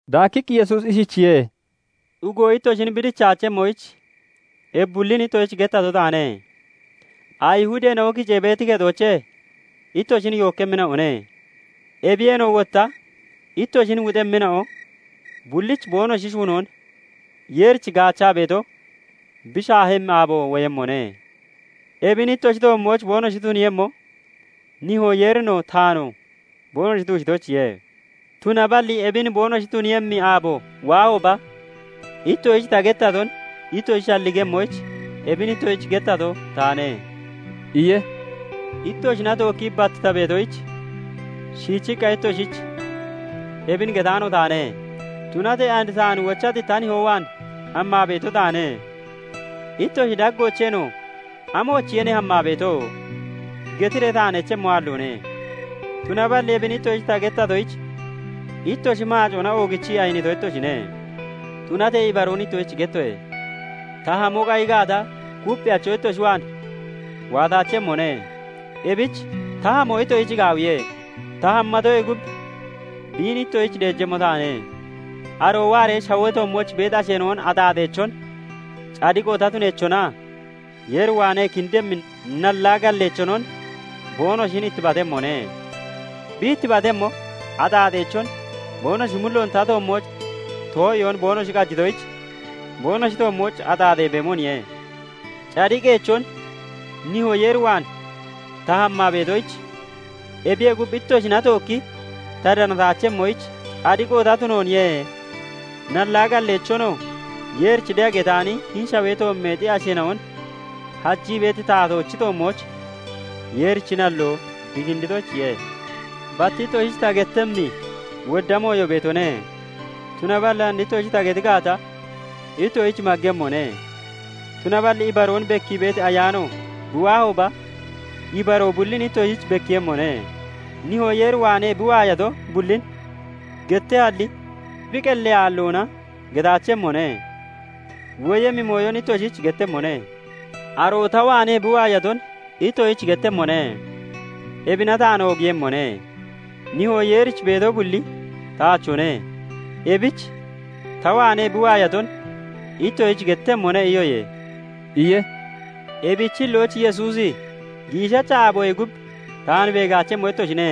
Daakkiqqi Yesuusi ishichiye:- "Xugo ittoshin bi dichaachemmoyich ebi bullin ittoshich gettato taane. Ayihudeena'o kicee beeti kexoochee ittoshin yookkemmina'one; ebiyeenoo wotta ittoshin wuxemmina'o bullich boonoshi shuunoo Yeerich gaachaa beeto bi shaahemmi aabo woyemmone. Ebin ittoshi toommooch boonoshi tuniiyemmo, Nihoo Yeerinoo taanoo boonoshi tuushitoyichiye. Tunaballi ebin boonoshi tuniiyemmi aabo waahooba, ittoshich ta gettaton ittoshi shalligemmoyich, ebin ittoshich gettato taane" iye. "Ittoshina tookkii bat ta beetoyich, shiichiqqa ittoshich ebin getaano taane. Tunatee and taan wochati ta nihoo waan hammaa beeto taane; ittoshi daggoocheenoo 'Amoochiye ne hammaa beeto?' getiree taan echemmo aalloone. Tunaballi ebin ittoshich ta gettatoyich, ittoshi maacoona oogichii ayinito ittoshine. Tunatee ibaroon ittoshich gettoye:- Ta hamo qayi gaata, Kupphiyacho ittoshi waan waataachemmone; ebich ta hamo ittoshich gaawiye. Ta hammatoyee gub biin ittoshich deejemmo taane. Aroo waaree, shawee toommooch beeti asheena'on axaaxeechon, cadiqo ta tuneechonaa Yeer waanee kindemmi nallaa galleechonon boonoshin ittibatemmone. Bi ittibatemmo axaaxeechon, boonoshi mulloon ta toommooch too'iyoon boonoshi qajitoyich, boonoshi toommooch axaaxee beemoniye; cadiqeechon, Nihoo Yeer waan ta hammaa beetoyich, ebiyee gub, ittoshina tookki ta danataachemmoyich cadiqo ta tunooniye; nallaa galleechonoo, Yeerich de'a getaani hini shawee toommeexi asheena'on hajii beeti taatoochi toommooch Yeerichi nalloo bi kinditoyichiye. "Bat ittoshich ta gettemmi wodda mooyo beetone; tunaballi and ittoshich ta geti gaata, ittoshich maggemmone. Tunaballi ibaroon bekkii beeti Ayaano bi waahooba, ibaroo bullin ittoshich bekkiiyemmone. Nihoo Yeer waanee bi waayato bullin gettehalli, bi qellee aalloona getaachemmone; woyemmi mooyon ittoshich gettemmone. Aroo ta waanee bi waayaton ittoshich gettemmone; ebina taan oogiiyemmone. Nihoo Yeerich beeto bulli taachone; ebich 'Ta waanee bi waayaton ittoshich gettemmone' iyoye" iye. Ebichi hillooch Yesuusi 'Giishacha aaboyee gub taan beegaachemmo ittoshine;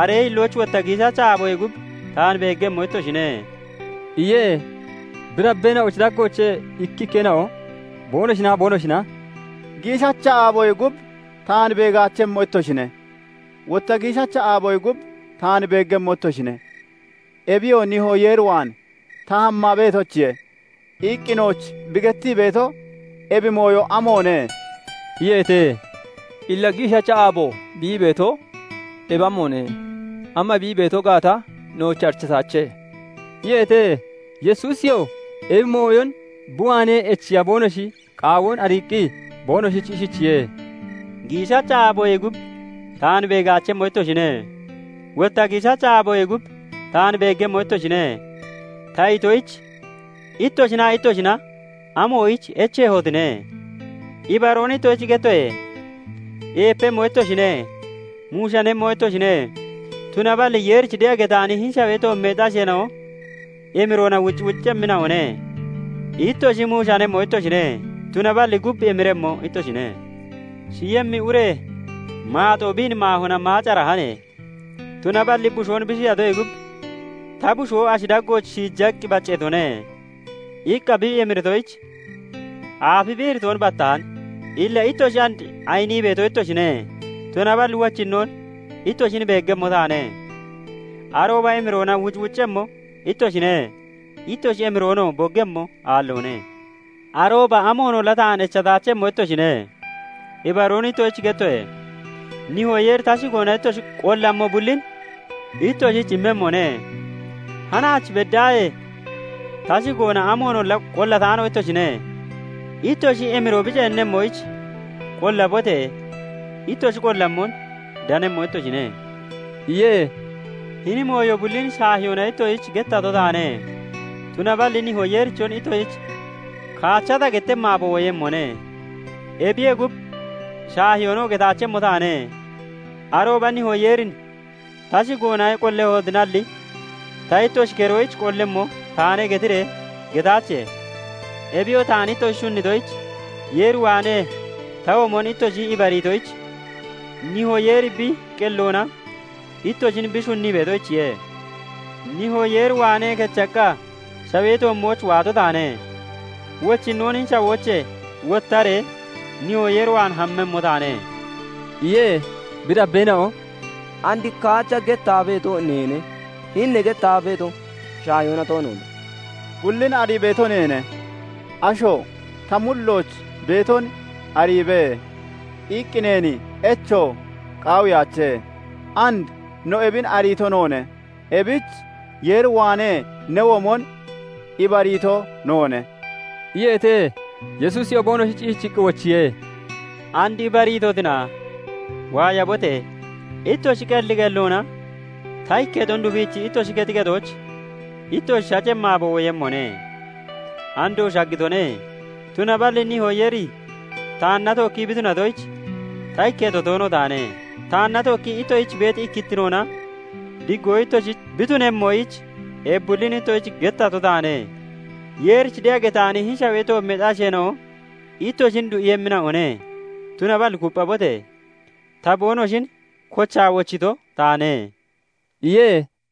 aree hillooch wotta giishacha aaboyee gub taan beeggemmo ittoshine" iye. Bi dabbeena'ochi daggoochee ikkikkeena'o boonoshinaa boonoshina " 'Giishacha aaboyee gub taan beegaachemmo ittoshine; wotta giishacha aaboyee gub taan beeggemmo ittoshine; ebiyoo Nihoo Yeer waan ta hammaa beetoyichiye' iqqi nooch bi gettii beeto ebi mooyo amoone?" iyeete. "Illa 'Giishacha aabo' bi ii beeto ebi amoone? Ama bi ii beeto gaata nooch arichataache" iyeete. Yesuusiyoo ebi mooyon bi waanee echiya boonoshi qaawoon ariiqqi boonoshich ishichiye:- " 'Giishacha aaboyee gub taan beegaachemmo ittoshine; wotta giishacha aaboyee gub taan beeggemmo ittoshine' ta itoyich, ittoshinaa ittoshina amoyich echeemmotine? Ibaroon ittoshich gettoye:- eepemmo ittoshine; muushanemmo ittoshine; tunaballi Yeerich de'a getaani hini shawee toommeexi asheena'o emiroona wucwuccemmina'one. Ittoshi muushanemmo ittoshine; tunaballi gub emiremmo ittoshine. Shiyemmi ure maaxoo biin maahona maacarahane; tunaballi bushoon bi shiyatoyee gub 'Ta bushoo ashi daggooch shiijaqqi bacceetone' iqqa bi emiritoyich, aafi bi iritoon battahan. Illa ittoshi and ayinii beeto ittoshine; tunaballi wochinnoon ittoshin beeggemmo taane; arooba emiroona wucwuccemmo ittoshine; ittoshi emiroonoo boggemmo aalloone. Arooba amoonolla taan echataachemmo ittoshine. Ibaroon ittoshich gettoye:- Nihoo Yeeri ta shigoona ittoshi qollammo bullin ittoshich immemmone. Hanaach beddaahee ta shigoona amoonolla qollaataano ittoshine; ittoshi emiroo bi ceennemmoyich, qollabote! Ittoshi qollammon danemmo ittoshine" iye. "Hini mooyo bullin shaahiyoona ittoshich gettato taane; tunaballi Nihoo Yeerichon ittoshich kaacha ta gettemmi aabo woyemmone; ebiyee gub, shaahiyoonoo getaachemmo taane. Arooba Nihoo Yeerin ta shigoona qollehotinalli, ta ittoshi keroyich qollemmo taane getiree getaache; Ebiyoo taan ittoshi shunnitoyich, Yeer waanee ta womon ittoshi ibariitoyich, Nihoo Yeeri bi qelloona ittoshin bi shunnii beetoyichiye. Nihoo Yeer waanee kechaqqa shawee toommooch waato taane; wochinnoon hini shawoochee wottaree Nihoo Yeer waan hammemmo taane" iye. Bi dabbeena'o "And kaacha gettaa beeto neene; hini ne gettaa beeto shaahiyoona toonoone. Bullin arii beeto neene; asho 'Ta mullooch beeton ariibe!' iqqi neen echo qaawiyaache; and no ebin ariito noone; ebich Yeer waanee ne womon ibariito noone" iyeete. Yesuusiyoo boonoshich ishichiqqi wochiye:- "And ibariitotina? Waayabote! Ittoshi qelli qelloona ta ikketon dufiichi ittoshi kexi kexooch ittoshi shacemmi aabo woyemmone; andoo shaggitone; tunaballi Nihoo Yeeri taanna tookkii bi tunatoyich, ta ikketo toono taane. "Taanna tookkii ittoshich beeti ikkittinoona diggoo ittoshich bi tunemmoyich, ebi bullin ittoshich gettato taane. Yeerich de'a getaani hini shawee toommeexi asheena'o ittoshin du'iiyemmina'one; tunaballi kupphabote! Ta boonoshin kochaa wochito taane" iye.